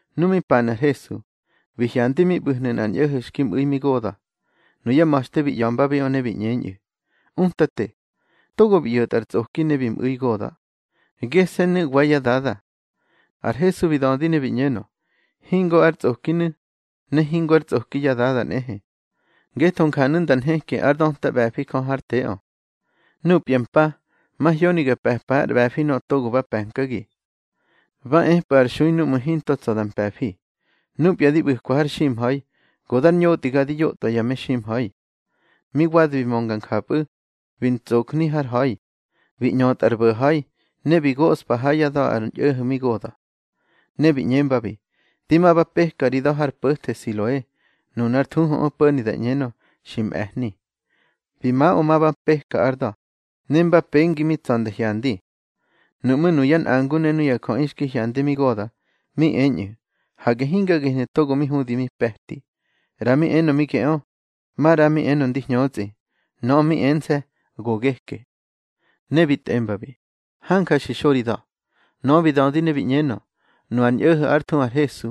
Nu mi panu̱ ar Hesu, bi hyandi mi ꞌbu̱hnu̱ nꞌar ñꞌo̱ho̱ xki mꞌu̱i mi goda̱. Nuyá ma̱xte bi ꞌya̱mbabiꞌö ne bi ꞌñeñꞌu̱: —Utate, togo bi ꞌyo̱tꞌa ar tsꞌoki ne bi mꞌu̱i goda̱, gese̱nu̱ wa yá dada. Ar Hesu bi dödi ne bi ꞌñenö: —Hingo ár tsꞌokinu̱, ne hingo ár tsꞌoki yá dada nꞌehe. Ngetho njanu̱ nda nheki ár döta ꞌbe̱fi Jö hár teꞌö. Núpya mpa, mahyoni ga pe̱pa ár ꞌbe̱fi nöꞌö togo ba pe̱nkagi. Ba epꞌu̱ ar xui núꞌmu̱ hinto tsa̱ da mpe̱fi. Núpya di ꞌbu̱kwa har ximha̱i, go dar ñotꞌiga di yotꞌwa ya meximha̱i. Mi wadi bi mönga njapꞌu̱, bi ntsojni har ha̱i, bi ꞌñötꞌa ar bo̱ha̱i. Ne bi goꞌspa ha yá da̱ ar ñꞌo̱ho̱ mi goda̱. Ne bi ꞌñembabi: —Di ma ba peka ri da̱ har po̱the Siloe (nunar thuhuꞌö po̱ni da ꞌñenö, xi mꞌe̱hni). Bi maꞌö ma ba peka ár da̱, ne mba pengi mi tsa̱ nda hyandi. Nuꞌmú̱ nuyá nꞌangu ne nuya jöꞌi xki hyandi mi goda̱, mi eñꞌu̱: —Hage hinga gehnu̱ togo mi hudi mi pe̱ti. ꞌRa mi enö mi geꞌö, maꞌra mi enö ndi hñötsꞌi. Nöꞌö mi ense̱: —Go geke. Ne bi tꞌembabi: —Hanja xi xo ri da̱. Nöꞌö bi dödi ne bi ꞌñenö: —Nu ar ñꞌo̱ho̱ ár thuhu ar Hesu,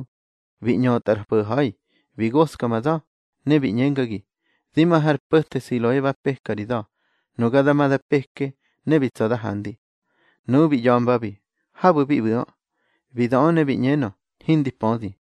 bi ꞌñötꞌa ar bo̱ha̱i, bi goska ma da̱, ne bi ꞌñengagi: Di ma har po̱the Siloe ba peka ri da̱. Nuga da ma da peke, ne bi tsa̱ da handi. Nuꞌu̱ bi ꞌya̱mbabi: —Habu̱ bi ꞌbu̱ꞌö. Bi döꞌö ne bi ꞌñenö: —Hindi pödi.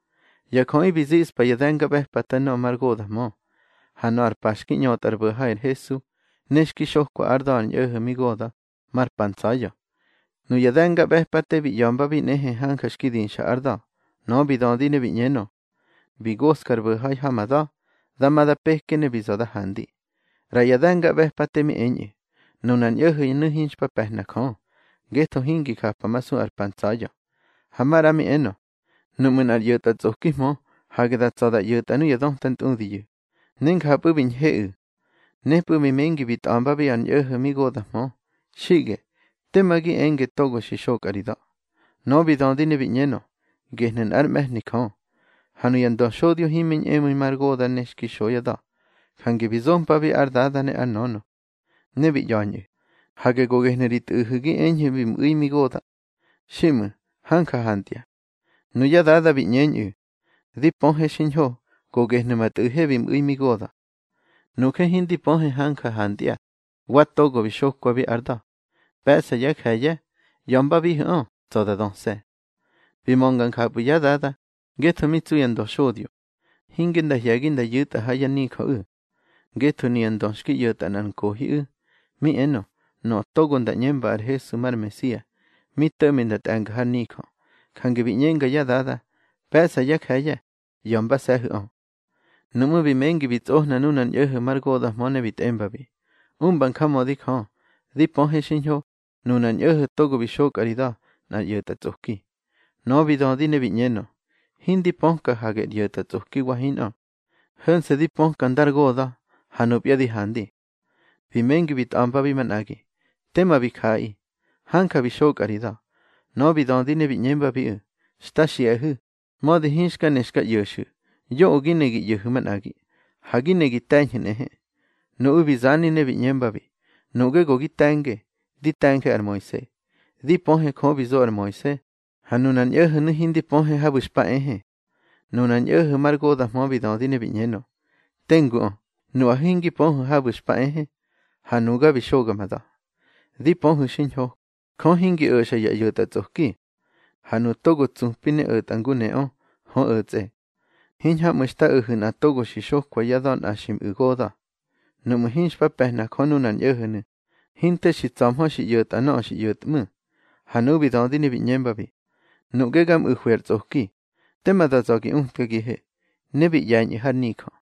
Ya jöꞌi bi ziꞌspa ya de̱ngaꞌbe̱pate nöꞌö mar goda̱hmö. Ha nöꞌö ar pa xki ꞌñötꞌa ar bo̱ha̱i ar Hesu, ne xki xokwa ár da̱ ar ñꞌo̱ho̱ mi goda̱, mar pa ntsa̱ya̱. Nuya de̱ngaꞌbe̱pate bi ꞌya̱mbabi nꞌehe hanja xki dixa ár da̱. Nöꞌö bi dödi ne bi ꞌñenö: —Bi goska ar bo̱ha̱i ha ma da̱, da ma da peke, ne bi za̱ da handi. ꞌRa ya de̱ngaꞌbe̱pate mi eñꞌu̱: —Nunar ñꞌo̱ho̱nu̱ hinxpa pe̱hna Jö, ngetho hingi japamasu ar pa ntsa̱ya̱. Ha maꞌra mi enö: —Nuꞌmu̱ nꞌar ꞌyo̱tꞌatsꞌokihmö, hage da tsa̱ da ꞌyo̱tꞌa nuya döta ntꞌudiyu̱. Ne njapꞌu̱ bi ñheꞌu̱. Nepꞌu̱ bi mengi bi tꞌembabi ar ñꞌo̱ho̱ mi goda̱hmö: —Xiꞌge, tema gi enge togo bi xokꞌa ri da̱. Nöꞌö bi dödi ne bi ꞌñenö: —Gehnu̱ nꞌár mꞌe̱hni Jö. Ha nuya ndöxodyo himi ñꞌemu̱i mar goda̱ ne xki xo yá da̱, jange bi zompabi ár dada ne ár nönö. Ne bi ñꞌa̱ñꞌu̱: —Hage go gehnu̱ ri tꞌu̱hu̱ gi eñhu̱ bi mꞌu̱i mi goda̱. Xiꞌmu̱, hanja hantya. Nuyá dada bi ꞌñeñꞌu̱: —Di pöhe xiñho, go gehnu̱ ma tꞌu̱he bi mꞌu̱i mi goda̱. Nuje hindi pöhe hanja hantya, wa togo bi xokwabi ár da̱. Pe̱ꞌsa yá je̱ye̱, ꞌya̱mbabihu̱ꞌö, tsa̱ da döse̱. Bi mönga njapꞌu̱ yá dada, ngetho mi tsu ya ndöxodyo, hinge nda hye̱gi nda yu̱tꞌa ha yá nijöꞌu̱. Ngetho nuya ndö xki ꞌyo̱tꞌa nꞌar nkohiꞌu̱, mi enö, nöꞌö togo nda ꞌñemba ar Hesu mar Mesia, mi to̱ꞌmi nda tꞌe̱nga har nijö. Jange bi ꞌñenga yá dada: Pe̱ꞌsa yá je̱ye̱, ꞌya̱mbase̱hu̱ꞌö. Nuꞌmú̱ bi mengi bi tsꞌohna nunar ñꞌo̱ho̱ mar goda̱hmö ne bi tꞌembabi: —Umba njamödi Jö. Di pöhe xiñho, nunar ñꞌo̱ho̱ togo bi xokꞌa ri da̱, nꞌar ꞌyo̱tꞌatsꞌoki. Nöꞌö bi dödi ne bi ꞌñenö: —Hindi pöka hage ar ꞌyo̱tꞌatsꞌoki wa hinꞌö. Ho̱nse̱ di pöka ndar goda̱, ha nupya di handi. Bi mengi bi tꞌa̱mbabi manꞌagi: —Tema bi jaꞌaꞌi. Hanja bi xokꞌa ri da̱. Nöꞌö bi dödi ne bi ꞌñembabiꞌu̱: —Xta xiꞌahu̱, mödi hinxka ne xka ꞌyo̱xu̱. Yoꞌö gi ne gi ꞌyo̱hu̱ manꞌagi. Ha gi ne gi te̱ñhu̱ nꞌehe. Nuꞌu̱ bi zani ne bi ꞌñembabi: —Nuꞌge go gi te̱nge. Di te̱nje ar Moise. Di pöhe Jö bi zo ar Moise, ha nunar ñꞌo̱ho̱nu̱ hindi pöhe habu̱ xpa ehe. Nunar ñꞌo̱ho̱ mar goda̱hmö bi dödi ne bi ꞌñenö: —Tenguꞌö, nuꞌahu̱ hingi pöhu̱ habu̱ xpa ehe, ha nuga bi xoga ma da̱. Di pöhu̱ xiñho, Jö hingi o̱xa ya ꞌyo̱tꞌatsꞌoki. Ha nuꞌu̱ togo tsupi ne o̱tꞌa ngu neꞌö, hö o̱tsꞌe. Hiñhamꞌu̱ xta o̱hu̱ nꞌa togo xi xokwa yá da̱ nꞌa xi mꞌu̱ goda̱. Nuꞌmu̱ hinxpa pe̱hna Jö nunar ñꞌo̱ho̱nu̱, hinte xi tsa̱hmö xi ꞌyo̱tꞌa nöꞌö xi ꞌyo̱tꞌmu̱. Ha nuꞌu̱ bi dödi ne bi ꞌñembabi: —Nuꞌge ga mꞌu̱hwi ar tsꞌoki. Tema da za̱ gi utkagihe. Ne bi ꞌye̱ñꞌu̱ har nijö.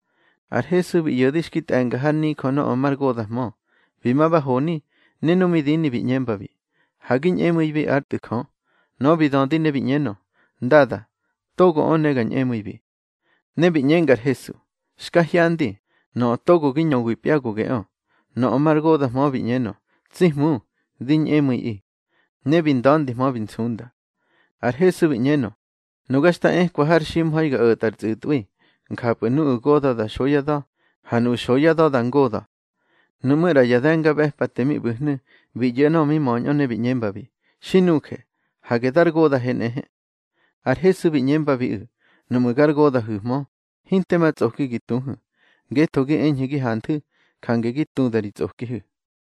Ar Hesu bi ꞌyo̱de xki tꞌe̱nga har nijö nöꞌö mar goda̱hmö. Bi ma ba honi, ne nu mi dini bi ꞌñembabi: —Ha gi ñꞌemu̱ibi ár Tꞌu̱ Jö. Nöꞌö bi dödi ne bi ꞌñenö: —Ndada, togoꞌö ne ga ñꞌemu̱ibi. Ne bi ꞌñenga ar Hesu: —Xka hyandi. Nöꞌö togo gi ñöwipya go geꞌö. Nöꞌö mar goda̱hmö bi ꞌñenö: —Tsi Hmu, di ñꞌemu̱iꞌi. Ne bi nda̱ndihmö bi nsunda. Ar Hesu bi ꞌñenö: —Nuga xta ekwa har ximha̱i ga o̱tꞌa ar tsꞌu̱tꞌwi. Njapꞌu̱ nuꞌu̱ goda̱ da xo yá da̱, ha nuꞌu̱ xo yá da̱ da ngoda̱. Nuꞌmú̱ ꞌra ya de̱ngaꞌbe̱pate mi ꞌbu̱hnu̱, bi ꞌyo̱ nöꞌö bi möñꞌö ne bi ꞌñembabi: —Xi nuje, hage dar goda̱he nꞌehe. Ar Hesu bi ꞌñembabiꞌu̱: —Nuꞌmu̱ gar goda̱hu̱hmö, hinte ma tsꞌoki gi tuhu̱. Ngetho gi eñhu̱ gi hanthu̱, jange gi tuda ri tsꞌokihu̱.